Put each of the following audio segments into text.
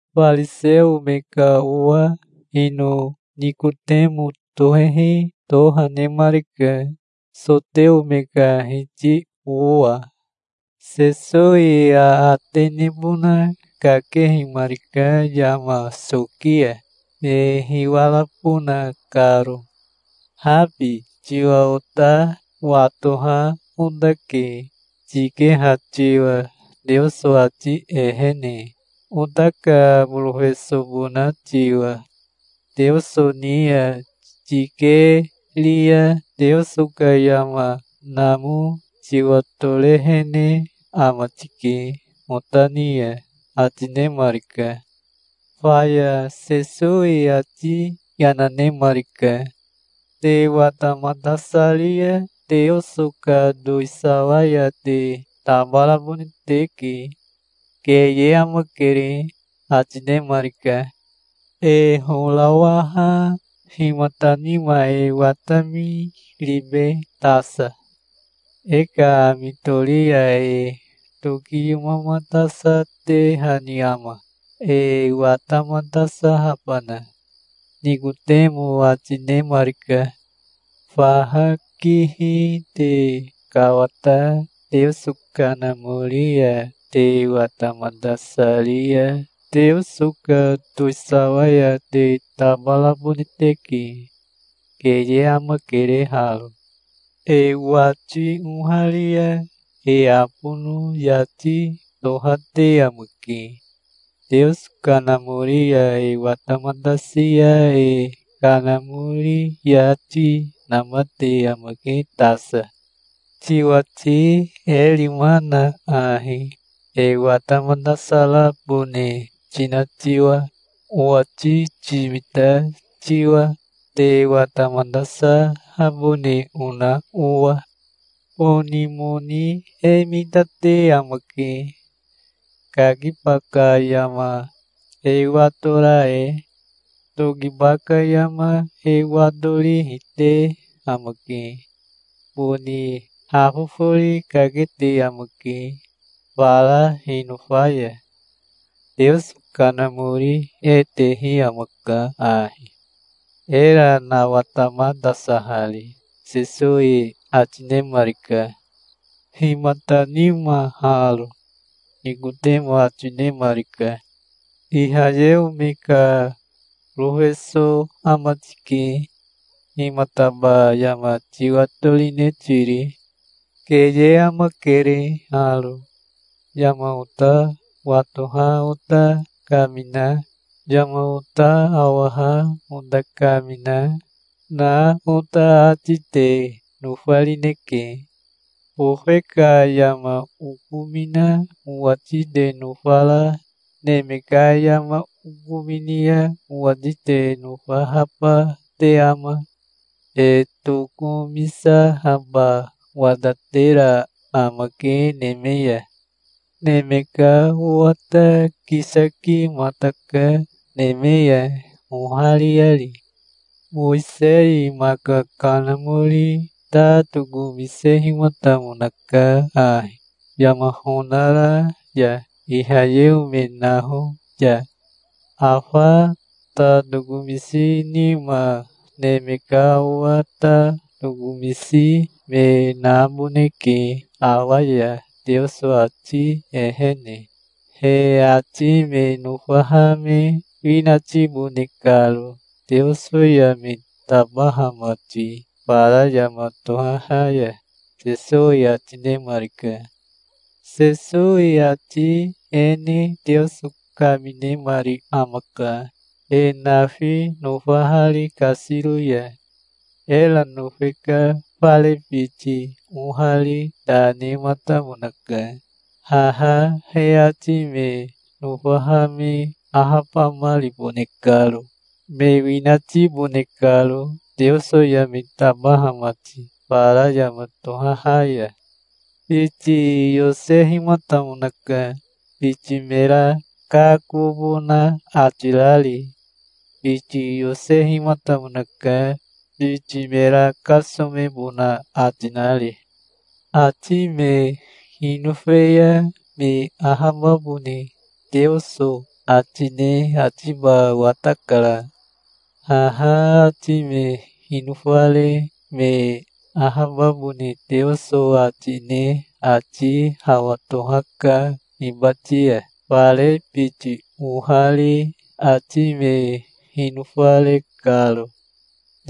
Fariseo me ka owa ino Nikotemo tohehi toha nemarika, soteo me ka hiti owa. Sesowi aate nebona kakehimarika yama soki ya, me hiwarabona karo. "Habi tiwa ota watoha otake, tikeha tiwa Teoso ati ehene, ota ka borofesobona tiwa. Teoso ni ya tikeri ya Teoso ka yama namo tiwatorehene ama tike ota ni ya", ati nemarika. Faya Sesowi ati yana nemarika. "Te watamatasari ya Teoso ka towisawa ya te tabarabone teke. Keye amakere", ati nemarika. "E horawaha himata nima e watami ribe tasa? E ka ami tori ya e tokiyomamatasatehani ama, e watamatasahabana?" Nikotemo ati nemarika. "Faha kihi te kawata Teoso Kanamori ya te watamatasari ya Teoso ka towisawa ya te tabarabone teke. Keye amakere haro. E wati oharia e abono yati tohate amake. Teoso Kanamori ya e watamatasi ya e kanamori yati namate amake tasa. Tiwati e rima na ahi, e watamatasarabone tina tiwa, owati timita tiwa, te watamatasahabone ona owa. Boni moni e mitate amake, kakiba ka yama e watora e. Tokiba ka yama e watorihi te amake. Boni hafofori kakete amake fara hinofa ya. Teoso Kanamori e tehi amaka ahi, era nawatamatasahari", Sesowi ati nemarika. "Himata nima haro?" Nikotemo ati nemarika. "Ihayeo me ka borofeso ama tike. Himataba yama tiwatorine tiri? Keye amakere haro. Yama ota watoha ota kamina, yama ota awaha ota kamina, na ota ati te nofarineke. Bofe ka yama okomina owati te nofara, neme ka yama okomini ya owati te nofahaba te ama? E tokomisahaba watatera amake neme ya. Neme ka Owa ta kisakimataka neme ya ohariari. Mowisei maka kanamori ta tokomisehimatamonaka ahi, yama honara ya Ihayeo me naho ya. Afa ta tokomisi nima Neme ka Owa ta tokomisi me naboneke awa ya Teoso ati ehene, he ati me nofaha me winatibone karo Teoso ya me tabaha mati fara yama tohaha ya", Sesowi ati nemarika. Sesowi ati e ne Teoso kaminemari amaka, e nafi nofahari kasiro ya. Era nofe ka fare biti ohari ta nematamonaka, haha he ati me nofaha me ahabamaribone karo, me winatibone karo Teoso ya me tabaha mati fara yama tohaha ya. Biti yosehimatamonaka, biti mera kakobona ati rari. Biti yosehimatamonaka, biti mera kasomebona ati nari. Ati me hinofe ya me ahababone Teoso ati ne atiba watakara. Haha ati me hinofare me ahababone Teoso ati ne ati hawa tohaka hibati ya, fare biti ohari ati me hinofare karo.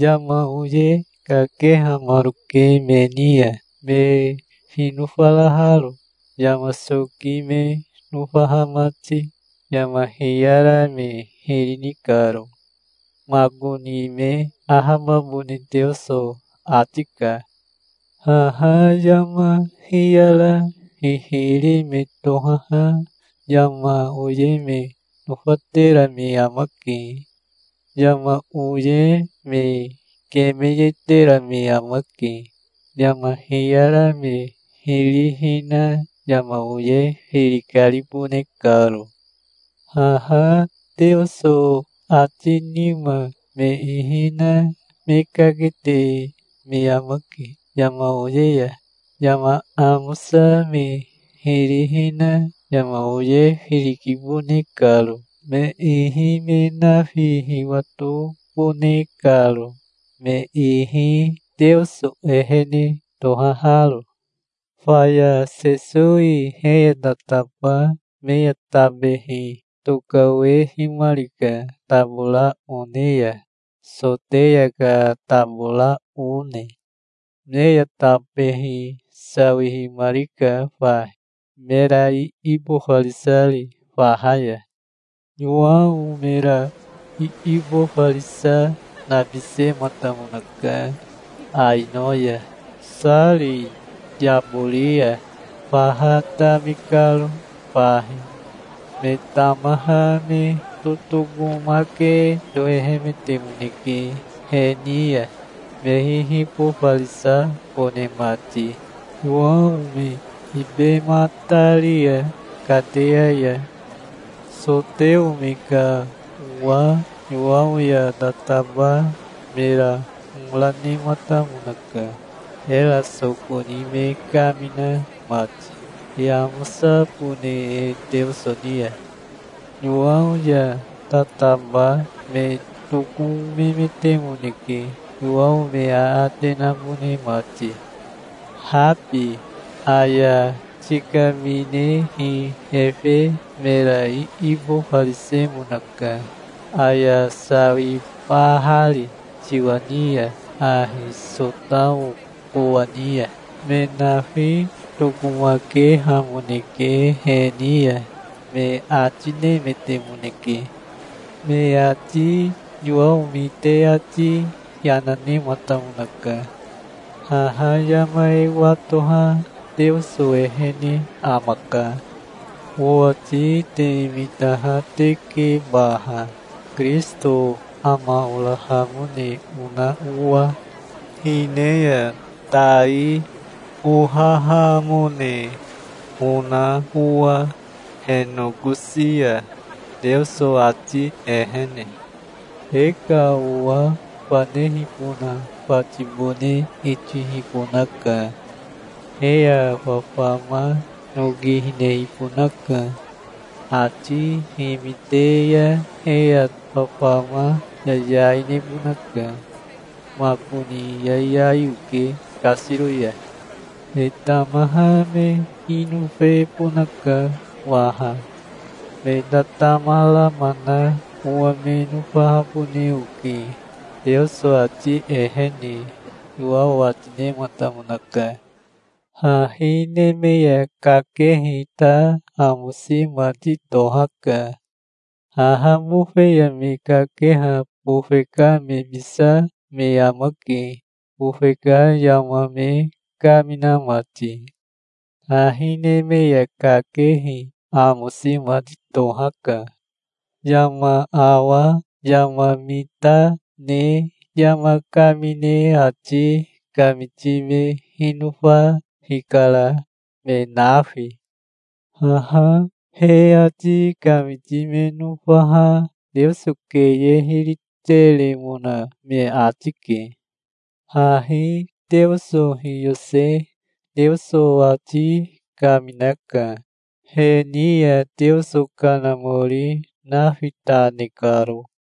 Yama oye kakehamaroke me ni ya, me hinofaraharo, yama soki me nofaha mati, yama hiyara me hiri ni karo. Makoni me ahababone Teoso ati ka. Haha yama hiyara hihiri me tohaha yama oye me nofatera me amake. Yama oye me kemeyetera me amake, yama hiyara me hiri hina yama oye firi karibone karo. Haha Teoso ati nima me ihi na me kakete me amake yama oye ya, yama amosa me hiri hina yama oye firi kibone karo, me ihi me nafi hiwatobone karo, me ihi Teoso ehene tohaharo. Faya Sesowi he ya tataba me ya tabehi tokawehimarika tabora one ya, Soteya ka tabora one. Me ya tabehi sawihimarika fahi, mera iibofarisari faha ya. Yowao mera iibofarisa nabisematamonaka Aino ya, Sari yabori ya, faha tami karo fahi. Me tamaha me totokomake tohehemetemoneke he ni ya, me hihibofarisabone mati, Yowao me ibematari ya kateya ya. Soteo me ka owa Yowao ya tataba mera hora nematamonaka, era soko ni me kamina mati e amosabone e Teoso ni ya. Yowao ya tataba me tokomemetemoneke Yowao me aate nabone mati. "Habi, aya tikaminehi efe mera iibofarisemonaka, aya sawibahari tiwa ni ya ahi Sotao kowani ya. Me nafi tokomakehamoneke he ni ya", me ati nemetemoneke. Me ati Yowao mite ati yana nematamonaka. "Haha yama e watoha Teoso ehene amaka. Owati te mitaha teke baha, Kirisito ama orahamone ona owa, hine ya tai ohahamone ona owa he nokosi ya, Teoso ati ehene. E ka owa fanehibona fatibone itihibonaka. He ya fafama noki hinehibonaka. Ati himite ya he ya fafama yayai nebonaka. Makoni yayai oke kasiro ya. Me tamaha me hinofebonaka waha. Me tatama rama na owa me nofahabone oke, Teoso ati ehene", Yowao ati nematamonaka. Hahi neme ya kakehi ta amosi mati tohaka. Haha bofe ya me kakeha bofe ka mebisa me amake, bofe ka yama me kamina mati. Hahi neme ya kakehi amosi mati tohaka. Yama awa yama mita ne yama kamine ati kamiti me hinofa hikara, me nafi. Haha he ati kamiti me nofaha Teoso keye hiri teremona me ati ke. Hahi Teoso hiyose Teoso ati kaminaka, he ni ya Teoso Kanamori nafi ta ne karo.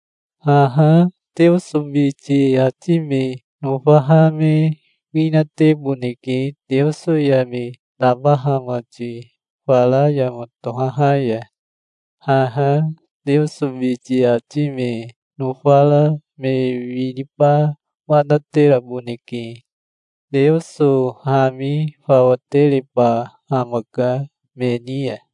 Haha Teoso biti ati me nofaha me winateboneke Teoso ya me tabaha mati fara yama tohaha ya. Haha Teoso biti ati me nofara me winiba watateraboneke. Teoso hami fawa tereba amaka me ni ya.